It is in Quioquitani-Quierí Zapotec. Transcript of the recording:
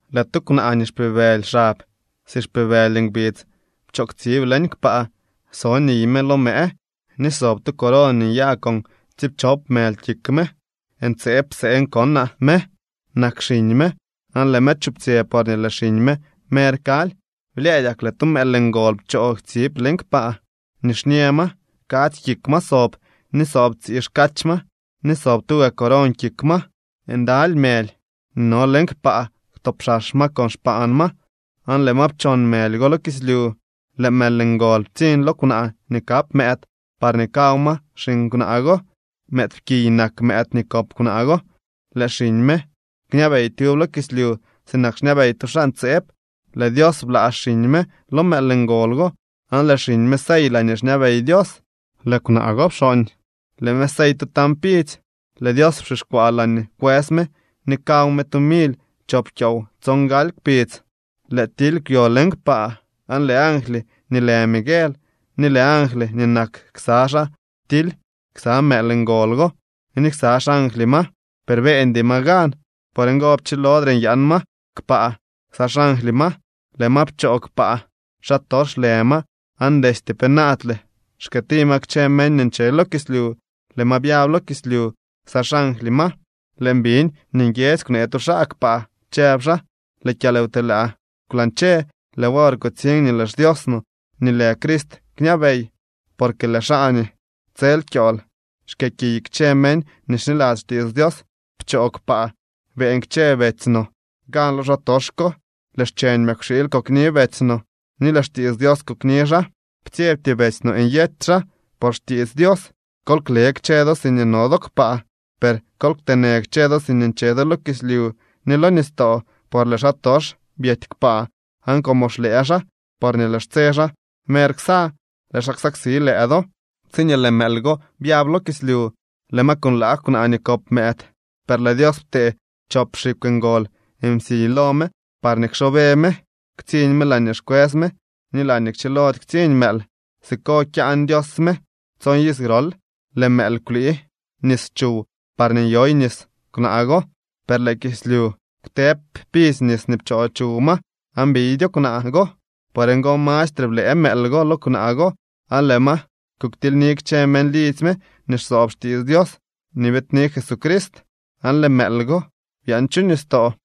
Lëë tu kwnaa nii xpibëly xab si xpibëly ngbidz pchoo ktsiib leñ kpaa so niy me lo mëë ni sob tu coron nii nyaa con tsiipchop mëly kik me. Ntseeb pseen konaa me. Nak xiñ me aan lëë me chuptsyë porñee lëë xiñ me mer kaly. Blyëëdyak lëë tu mëël ngol pchoo ktsiib leñ kpaa, nixñë ma, kadzy kik ma sob, ni sob tsii xkach ma, ni sob tuga coron kik ma. Ndaly mëly nii no leñ kpaa kwtopxax ma con xpaan ma aan lëë ma pchon mëly go lo kislyu. Lëë mëël ngol ptsiñ lo kwnaa nii kap mëëd parñee kaw ma xiñ kwnaa go. Mëëdpkiy nak mëëd nii kop kwnaa go, lëë xiñ me kñabey tyub lo kislyu sinak xñabey tu xaa ntseeb. Lëë Dios bla xiñ me lo mëël ngol go aan lëë xiñ me sey laañee xñabey Dios. Lëë kwnaa go pxooñ, lëë me sey tu tañ pidzy. Lëë Dios pxixkwaa laañee kwës me ni kaw me tu mily chop kyoow tsongaly kpidz. Lëë tily kwyo leñ kpaa, aan lëë angly nii lë Miguel ni lëë angly nii nak ksa xaa ptily ksa mëël ngol go ni ksa xangly ma, per beeñdy ma gan. Por ngo pchilodre nyaan ma kpaa ksa xangly ma. Lëë ma pchoo kpaa. Xaa tox lë ma aan destye penaadle xkëëti ma kchë meñ nii nche lo kislyu. Lëë ma byab lo kislyu ksa xangly ma. Lëën biñ nii nguiedzy kwnee tu xaa kpaa, chëb xaa: —Lëë kyalwtelaa kwlañche, lëë wor kutsiñ nii lëë xDios no ni lëë Crist kñabey, porque lëë xaa nii tsel kyool xkëëkiy kchë meñ nii xniladzy xtiits Dios pchoo kpaa. Beeñ kchë betsy no gan lo xaatox ko. Lëë xcheñ mëkwxiily kokni betsy no ni lëë xtiits Dios kokni xaa. Ptsyebty betsy no nyety xaa por xtiits Dios. Kol kle kchë do siñee no do kpaa. Per ¡kol kteenë kchë do siñee nche do lo kislyu ni lo nistoo! Por lëë xaatox byety kpaa aan como xlëë xaa porñee lëë xtse xaa mer ksa, lëë xaa ksaksi lëë do. Tsiñee lëë mëël go byab lo kislyu, lëë ma kunlaag kwnaa nii kop mëëd. Per lëë Dios ptee chop xikw ngol msiy lo me parñee kxoobe me ktsiñ me laañee xkwës me ni laañee kchilody ktsiñ mëël. Siko kyaan Dios me tson iz grol. Lëë mëël kwlii nis chuw parñee nyoy nis kwnaa go, per lëë kislyu kwtëëb pidzy nis nii pchoo chuw ma aan biydyo kwnaa go. Por ngo mastre blëë mëël go lo kwnaa go aan lëë ma kuktilyni kchë meñ lidzy me nii xsoob xtiits Dios nii biidni Jesucrist. Aan lëë mëël go byaan chu nistoo.